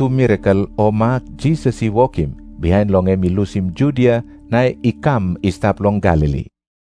mirakel o mak Jisas i wokim bihain long em i lusim Judia na i kam i stap long Galili.